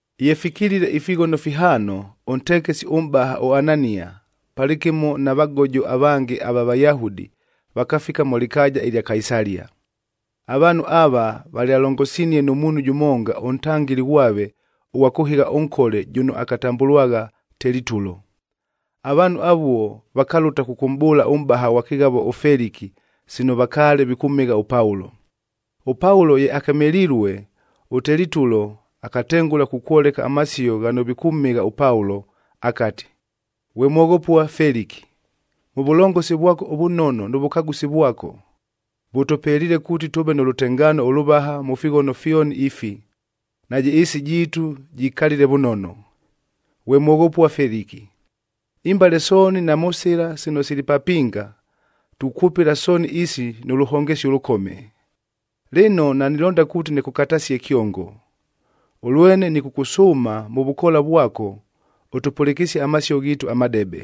Ye fikilile ifighono fihaano, ʉntekesi ʉmʼbaha ʉAnania palɨkɨmo na vagojo avange ava Vayahudi, vakafika mʉ lɨkaaja ɨlya Kaisalia. Avaanhu ava valyalongosinie nʉ muunhu jʉmonga ʉntangɨli ghwave ʉghwa kʉhɨgha ʉnkole jʉno akatambʉlwagha Telitulo. Avaanhu avuo vakalʉta kʉkʉmʼbʉʉla ʉmʼbaha ghwa kɨghavo ʉFeliki sino vakaale vikʉmhɨgha ʉPaulo. ɄPaulo ye akemelilue, ʉTelitulo akatengʉla kukwoleka amasio ghano vikʉmhɨgha ʉPaulo akati, “Ghwe mwoghopua Feliki, mʉ vʉlongosi vwako ʉvʉnono nʉ vʉkagʉsi vwako, vʉtʉpeliile kuuti tʉʉve nʉ lʉtengaano ʉlʉvaha mʉ fighono fyoni ifi, najɨ ɨɨsi jiitu jikalile vʉnono. Ghwe mwoghopua Feliki, imbale sooni na mʉ sɨla sino sili papinga tukwʉpɨla sooni isi nʉ lʉhongesio ʉlʉkome. Lɨno, nanilonda kuuti nɨkʉkatasie kyongo, ʉlwene nɨkʉkʉsʉʉma mʉ vʉkoola vwako ʉtʉpʉlɨkɨsie amasio ghiitu amadebe.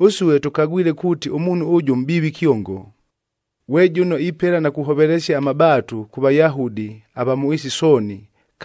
“Ʉsue tʉkagwile kuuti ʉmuunhu ʉjʉ mʼbiivi kyongo, ghwe jʉno ipela na kuhovelesia amabaatu kʉ Vayahudi ava mʉ ɨɨsi sooni,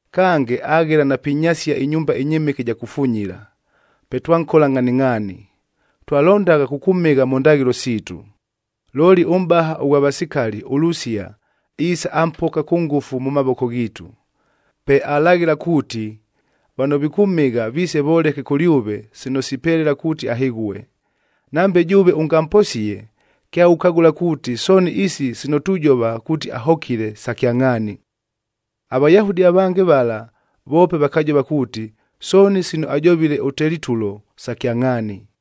Kange, aghela na pinyasiab ɨnyumba ɨnyɨmɨke ɨja kufunyila. Pe twankola ngʼhaningʼhaani. Twalondagha kʉkʉmhɨgha mʉ ndaghɨlo siitu, looli ʉmʼbaha ʉghwa vasikali ʉLusia iisa ampoka kʉ ngʉfu mʉ mavoko ghiitu. Pe alaghɨla kuuti, vano vikʉmhɨgha viise voleke kʉlyʉve sino sipelela kuuti ahɨghue.c Nambe jʉʉve ʉngamposie, kyaghukagʉla kuuti sooni isi sino tujova kuuti ahokile, sa kyangʼhaani.” AVayahudi avange vala voope vakajova kuuti, sooni sino ajovile ʉTelitulo sa kyangʼhaani.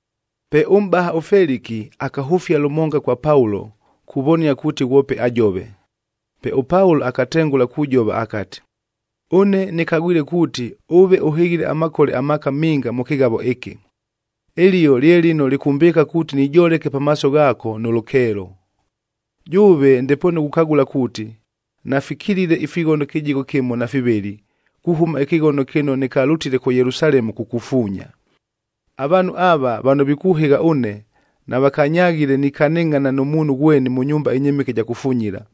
Pe ʉmʼbaha ʉFeliki akahʉfia lʉmonga kwa Paulo kuvonia kuuti ghwope ajove. Pe ʉPaulo akatengʉla kujova akati, “Ʉne nɨkagwile kuuti, ʉve ʉhɨghile amakole amaaka minga mʉ kɨghavo ɨkɨ. Ɨlio lye lɨno lɨkʉmʼbɨɨka kuuti nijoleke pamaaso ghaako nʉ lʉkeelo. Jʉʉve ndepoonu ghukagʉla kuuti, nafikilile ifighono kɨjigho kɨmo na fivɨlɨ, kuhʉma ɨkɨghono kɨno nɨkalʉtile kʉ Yelusalemu kukufuunya. Avaanhu ava, vano vikʉhɨgha ʉne navakanyaghile nikanɨngʼhana nʉ muunhu ghweni mʉ nyumba ɨnyɨmɨke ɨja kufunyila,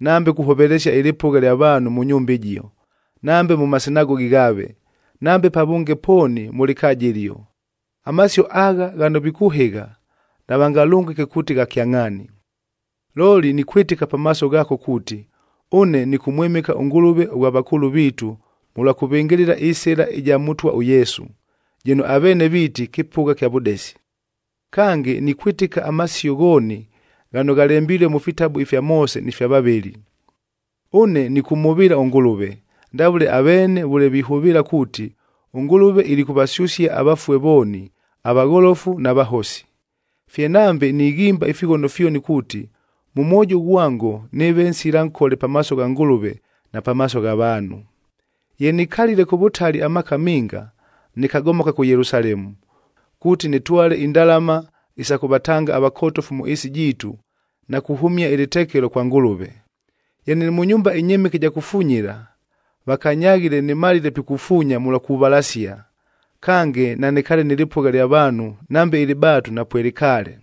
nambe kuhovelesia ɨlɨpʉgha lya vaanhu mʉ nyumba ɨjio, nambe mʉ masinagogi ghaave, nambe pavʉnge pooni mʉ lɨkaaja ɨlio. Amasio agha ghano vikʉhɨgha, navangalʉngɨke kuuti gha kyangʼhaani. “Looli nikwɨtɨka pamaaso ghaako kuuti, ʉne nɨkʉmwɨmɨka ʉNgʉlʉve ʉghwa vakʉʉlʉ viitu mʉlwa kʉvɨngɨlɨla ɨSɨla ɨja Mʉtwa ʉYesu,d jɨno aveene viiti kɨpʉgha kya vʉdesi. Kange, nikwɨtɨka amasio ghooni ghano ghalembilue mʉ fitabu ifya Moose ni fya vavɨli. Ʉne nɨkʉmhʉvɨɨla ʉNgʉlʉve, ndavʉle aveenee vʉle vihʉvɨɨla kuuti, ʉNgʉlʉve ilikʉvasyʉsia avafue vooni, avagholofu na vahosi. Fye nambe nighimba ifighono fyoni kuuti, mʉ mwojo ghwango nɨɨve nsila nkole pamaaso gha Ngʉlʉve na pamaaso gha vaanhu. “Ye nikalile kʉ vʉtali amaaka minga, nɨkagomoka kʉ Yelusalemu, kuuti nɨtwale indalama isa kʉvatanga avakotofu mʉ ɨɨsi jiitu na kuhʉmia ɨlɨtekelo kwa Ngʉlʉve. Ye nɨlɨ mʉ nyumba ɨnyɨmɨke ɨja kufunyila, vakanyaghile nɨmalile pikufuunya mʉlwa kuvalasia, kange nanɨkaale nɨ lɨpʉgha ɨlya vaanhu nambe ɨlɨbaatu napwelɨkaale.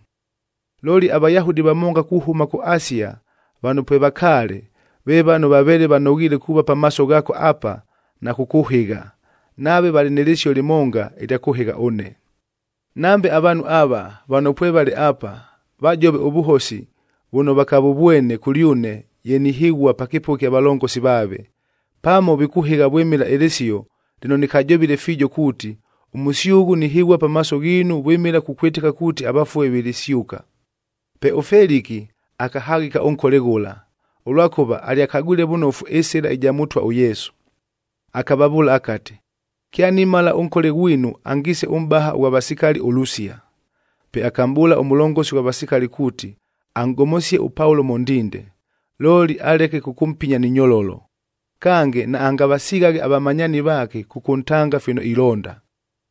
Looli aVayahudi vamonga kuhʉma kʉ Asia vano pwevakaale, ve vano vaveele vanoghiile kuuva pamaaso ghaako apa na kʉkʉhɨgha, nave valɨ nɨ lɨsio lɨmonga ɨlya kʉhɨgha ʉne. Nambe avaanhu ava, vano pwevale apa vajove ʉvʉhosi vʉno vakavʉvwene kʉlyʉne ye nihɨghua pa kɨpʉgha ɨkya valongosi vaave. Pamo vikʉhɨgha vwɨmɨla ɨlɨsio lɨno nɨkajovile fiijo kuuti, ‘Ʉmʉsyʉghʉ nihɨghua pamaaso ghiinu vwɨmɨla kukwɨtɨka kuuti avafue vilisyʉka.’” Pe ʉFeliki akahaghɨka ʉnkole ghʉla, ʉlwakʉva alyakagwile vʉnofu ɨSɨla ɨja Mʉtwa ʉYesu. Akavavʉʉla akati, “Kyanimala ʉnkole ghwinu angiise ʉmʼbaha ʉghwa vasikali ʉLusia.” Pe akamʼbʉʉla ʉmʉlongosi ghwa vasikali kuuti anʼgomosie ʉPaulo mʉ ndinde, looli aleke kʉkʉmpinya ni nyololo, kange naangavasighaghe avamanyaani vaake kʉkʉntanga fino ilonda.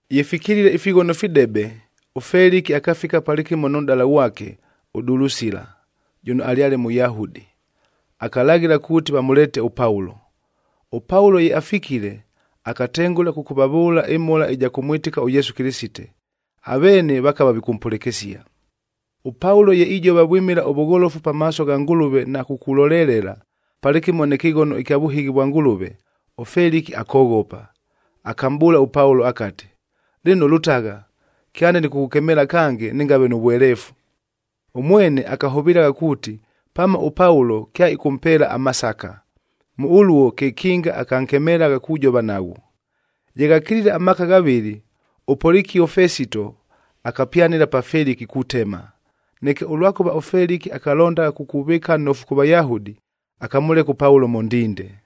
Ye fikilile ifighono fidebe, ʉFeliki akafika palɨkɨmo nʉ nʼdala ghwake ʉDulusila jʉno alyale Mʉyahudi, akalaghɨla kuuti vamʉleete ʉPaulo. ɄPaulo ye afikile, akatengʉla kʉkʉvavʉʉla ɨmhola ɨja kʉmwɨtɨka ʉYesu Kɨlɨsite, aveene vakava vikʉmpʉlɨkɨsia. ɄPaulo ye ijova vwɨmɨla ʉvʉgholofu pamaaso gha Ngʉlʉve na kukulolelela, palɨkɨmo nɨ kɨghono ɨkya vʉhɨghi vwa Ngʉlʉve, ʉFeliki akoghopa. Akamʼbʉʉla ʉPaulo akati, “Lɨno lʉtagha, kyande nɨkʉkʉkemeela kange nɨngave nʉ vweleefu.” Ʉmwene akahʉvɨlagha kuuti, pamo ʉPaulo kyaɨkʉmpeela amasaka, mʉ ʉluo kekinga akankemelagha kujova naghwo. Ye ghakilile amaaka ghavɨlɨ,f ʉPolikio Fesito akapyanɨla pa Feliki kutema. Neke ʉlwakʉva ʉFeliki akalondagha kukuvɨɨka nnofu kʉ Vayahudi, akamʉleka ʉPaulo mʉ ndinde.